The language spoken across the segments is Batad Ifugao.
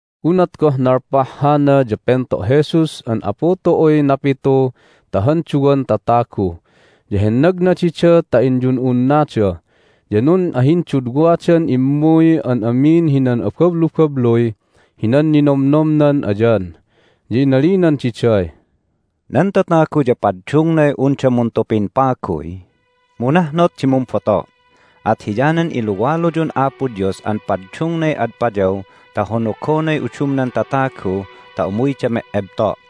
Unat goh nalpah hana ya pento' Jesus an Apu tu'uy napitu ta han duwan tatagu, ya hennagna dida ta inyun'unnada. Ya nun'ahindudwadan immuy an amin hinan abablubabluy hinan ninomnomnan ayan. Ya inalinan diday, "Nan tatagu ya paddungnay unda muntupin paguy, mu nahnot di mumboto'. At hiyanan iluwaluyun Apo Dios an paddungnay ad payaw ta honogonay udumnan tatagu ta umuyda me'ebto'.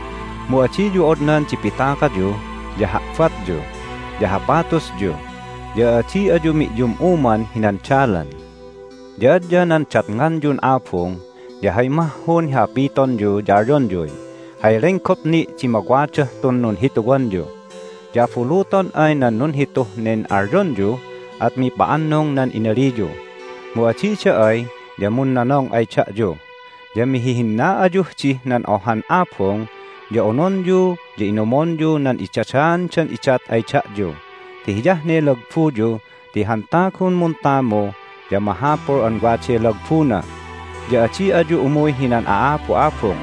Mu adiyu odnan di pitakayu, ya ha'batyu, ya hapatusyu, ya adi ayu mi'yum'uman hinan dalan. Ya adya nan datnganyun abung ya hay mahhun hi hapitonyu ya alyonyuy, Hay lenggop ni' di mawadah tun nunhituwanyu! Ya abuluton ay nan nunhituh nen alyonyu at mipa'annung nan inaliyu, mu adida ay ya munnonong ay da'yu. Ya mihihinna ayuh dih nan ohan abung, ya ononyu ya inumonyu nan idadaandan idat ay da'yu ti hiyah ne lagbuyu ti han tagun muntamu ya mahapul an waday lagbuna. Ya adi ayu umuy hinan a'abu'abung.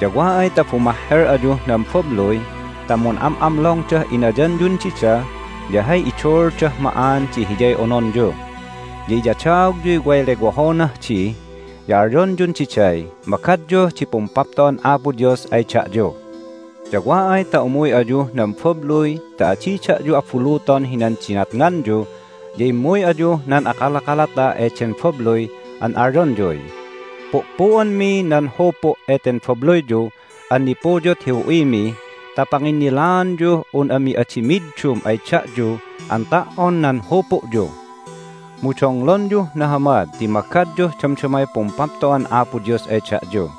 Ya wa ay ta bumahhel ayuh nan babluy ta mun'am'amlongdah inayanyun dida ya hay iduuldah ma'an di hiyay ononyu. Ya iyadaogyuy way lewohonah di, ya alyonyun diday, Magadyuh di Pumpapto'an Apo Dios ay da'yu! Ya wa ay ta umuy ayuh nan babluy ta adi da'yu abuluton hinan dinatnganyu ya immuy ayuh nan akalakalata eden babluy an alyonyuy, Pu'pu'anmi nan hupu' eten babluyyu an nipuyut hi hu'imi ta panginnilaanyuh un ami adi middum ay da'yu an ta"on nan hupu'yu. Mu donglonyuh nahamad ti magadyuh damdamay Pumpapto'an Apo Dios ay da'yu!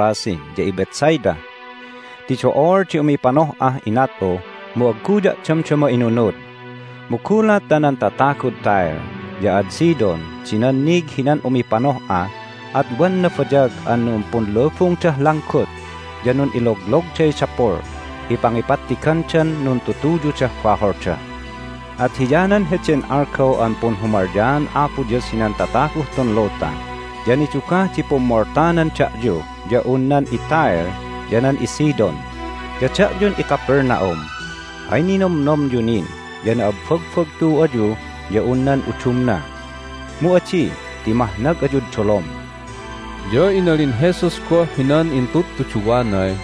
Ya inalin Jesus di, "Mahmo' ayun iKorazin ya iBethsaida! Ti do'ol di umipanoh'ah inat'u, mu agguya' damdama inunud! Mu gulat ta nan tatagud Tyre ya ad Sidon di nannig hinan umipanoh'a at wan nabayag an numpunlubungdah langgut ya nun'iloglogday dapul hi pangipattigandan nuntutuyudah baholda! At hiyanan heden algaw an Punhumalyaan Apo Dios hinan tataguh tun luta ya nidugah di pummoltanan da'yu ya un nan iTyre ya nan iSidon! Ya da'yun iCapernaum, hay ninomnomyu nin ya na'abbagbagtu ayu ya un nan udumna. Mu adi ti mahnag ayud dolom!" Ya inalin Jesus goh hinan intudtuduwanay,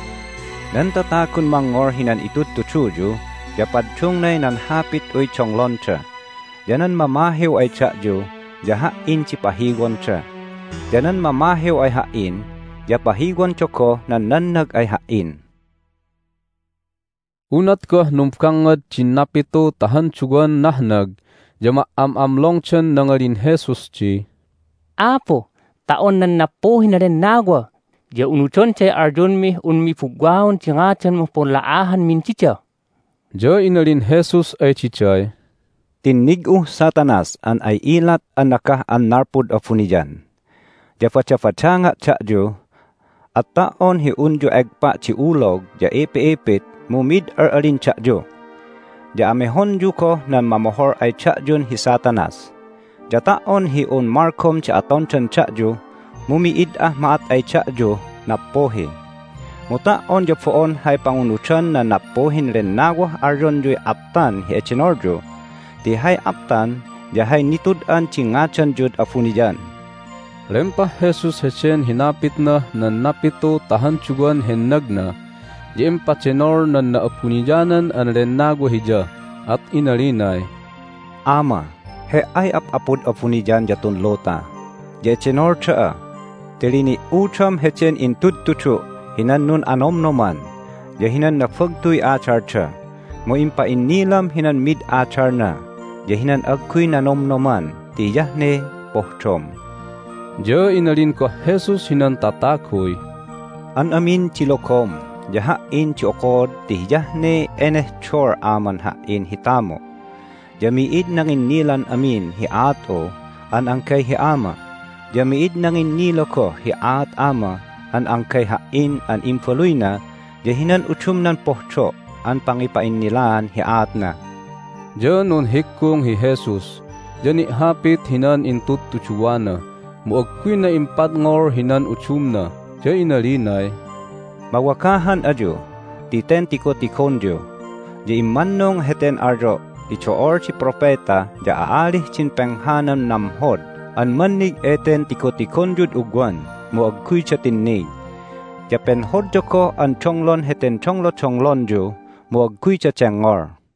"Nan tatagun mangngol hinan itudtuduyu ya paddungnay nan hapit'uy donglonda, ya nan mamahiw ay da'yu ya Ha"in di pahiwonda. Ya nan mamahiw ay Ha"in ya pahiwonda goh nan nannag ay Ha"in." Hay Numbangngadan din Napitu ta han Duwan Nahnag Unat goh numbangngad din napitu ta han duwan nahnag ya ma"am'amlongdan nangalin Jesus di, "Apu, ta"on nan nappuhin lennawa ya unudonday alyonmih unmi bugwaon di ngadanmuh punla'ahanmin dida!" Ya inalin Jesus ay diday, "Tinnig'uh Satanas an ay ilat an nagah an nalpud abuniyan! Ya badabadanga' da'yu, at ta"on hi unyu egpa' di ulog ya ipi'ipit mu mid al'alin da'yu, ya amehonyu goh nan mamohol ay da'yun hi Satanas. Ya ta"on hi un malgom di atondan da'yu mu mi'id ah ma'at ay da'yuh nappuhi. Mu ta"on ya bo'on hay pangunudan nan nappuhin lennawah alyonyuy aptan hi edenolyu, ti hay aptan ya hay nitud'an di ngadanyud abuniyan." Hay Nundenolan Jesus Lempah Jesus heden hinapitnah nan napitu ta han duwan hennagna ya impadenol nan Na'abuniyanan an Lennawa Hiya, at inalinay, "Ama, He"ay Ap'apud abuniyan ya tun luta, ya edenol da'a ti lini"udam heden intudtudu' hinan nun'anomnoman ya hinan nabagtuy adalda, mu impa'innilam hinan mid adalna ya hinan agguy nanomnoman ti hiyah ne pohdom." Ya inalin goh Jesus hinan tataguy, "An amin di logom ya Ha"in di okod ti hiyah ne enehdol Aman Ha"in hi tamu'. Ya mi'id nanginnilan amin hi aat'u an anggay hi Ama. Ya mi'id nanginnila goh hi aat Ama an anggay Ha"in an Imbaluyna ya hinan udumnan pohdo' an pangipa'innilaan hi aatna." Ya nunhiggung hi Jesus, ya ni'hapit hinan intudtuduwana, mu agguyna impadngol hinan udumna, ya inalinay, "Mawagahan ayu ti ten tigotigonyu. Ya immannung heten alyo' ti do'ol di propeta ya a'alih din penghanan namhod an mannig eten tigotigonyud ugwan, mu agguyda tinnig. Ya penhodda goh an donglon heten donglodonglonyu, mu agguyda dengngol."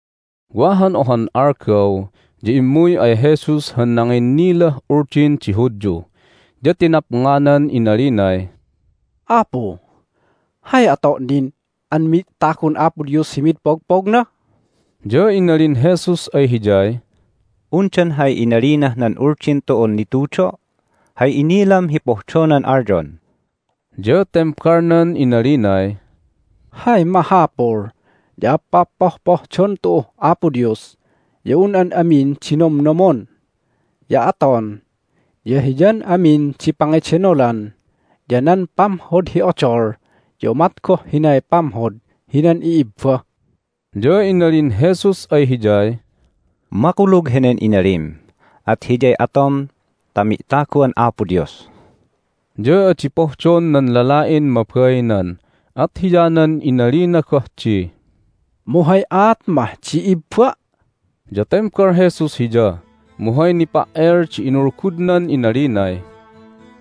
Wa han ohan algaw ya immuy ay Jesus han nanginnilah Uldin di Hudyu. Ya tinapnganan inalinay, "Apu, hay ato' nin an mi'tagun Apo Dios hi mid pogpogna?" Ya inalin Jesus ay hiyay, "Undan hay inalinah nan Uldin tu'un nitudo'? Hay inilam hi pohdonan alyon?" Ya tembalnan inalinay, "Hay mahapul ya pa'appohpohdon tu'uh Apo Dios ya un an amin di nomnomon, ya aton, ya hiyan amin di pangidenolan ya nan pamhod hi odol ya umat goh hinay pamhod hinan i'ibba." Ya inalin Jesus ay hiyay, "Makulug henen inalim. At hiyay atom ta mi'tagu'an Apo Dios." Ya adi pohdon nan lala'in mabainan, at hiyanan inalina goh di, "Mu hay aat mah di ibba'?" Ya tembal Jesus hiya, mu hay nipa"el di inulgudnan inalinay,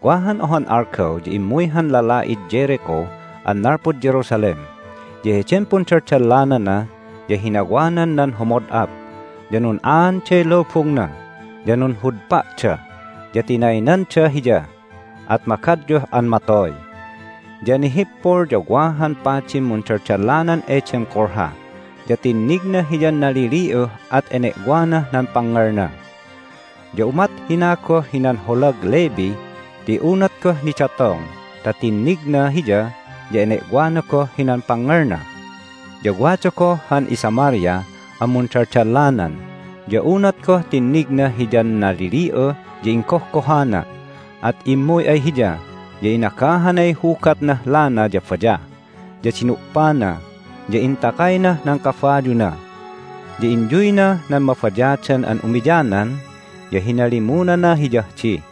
"Wa han ohan algaw ya immuy han lala'id Jericho an nalpud Jerusalem, ya heden pundaldallanana ya hinawanan nan humod'ap, ya nun'aanday lubungna, ya nunhudpa'da, ya tinaynanda hiya, at magadyuh an matoy. Ya nihippul ya wada han padin mundaldallanan eden kulha, ya tinnigna hiyan nalili'uh, at ene'wanah nan pangngelna. Ya umat hina goh hinan holag Levi ti unat goh nidatong ta tinnigna hiya ya ene'wana goh hinan pangngelna. Ya wada goh han iSamaria an mundaldallanan. Ya unat goh tinnigna hiyan nalili'uh ya inggohgohana. At immuy ay hiya, ya inagahanay hugatnah lana ya bayah, ya dinu'pana, ya intakaynah nan kabayuna. Ya inyuynah nan mabayadan an umiyanan, ya hinalimunana hiyah di.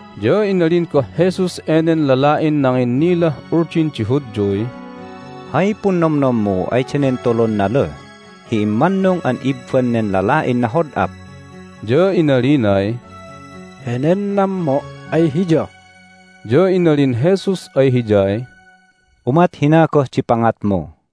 Ya inalin goh Jesus enen lala'in nanginnilah Uldin di Hudyuy, "Hay punnomnommu ay danen tulun naluh hi immannung an ibban nen lala'in nahod'up?" Ya inalinay, "Henen nammo' ay hiya." Ya inalin Jesus ay hiyay, "Umat hina goh di pangatmu."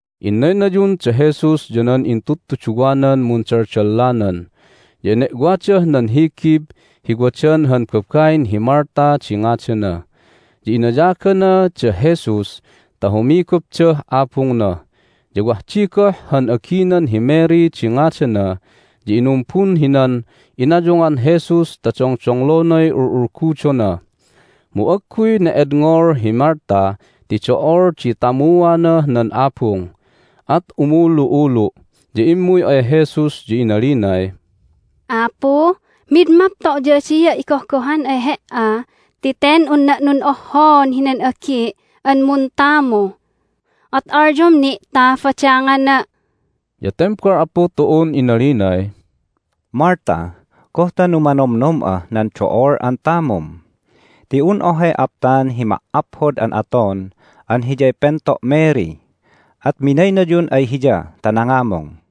Innaynayun da Jesus ya nan intudtuduwanan mundaldallanan, ya ene'wadah nan higib hi wadan han babain hi Martha di ngadana. Ya inayagana da Jesus ta humigupdah abungna. Ya wah di goh han aginan hi Mary di ngadana, ya inumbun hinan inayungan Jesus ta dongdonglonay ul'ulgudona. Mu agguy ne'edngol hi Martha ti do'ol di tamuanah nan abung, at umulu'ulu', ya immuy ay Jesus, ya inalinay, "Apu, mid mapto' ya adia' igohgohan ay He"a ti ten unna' nun'ohhoon hinan agi' an muntamu! At alyom ni' ta badangana'!" Ya tembal Apu tu'un inalinay, "Martha! Goh ta numanomnom'ah nan do'ol an tamum? Ti un ohay aptan hi ma"aphod an aton an hiyay pento' Mary, at minaynayun ay hiya ta nangamung."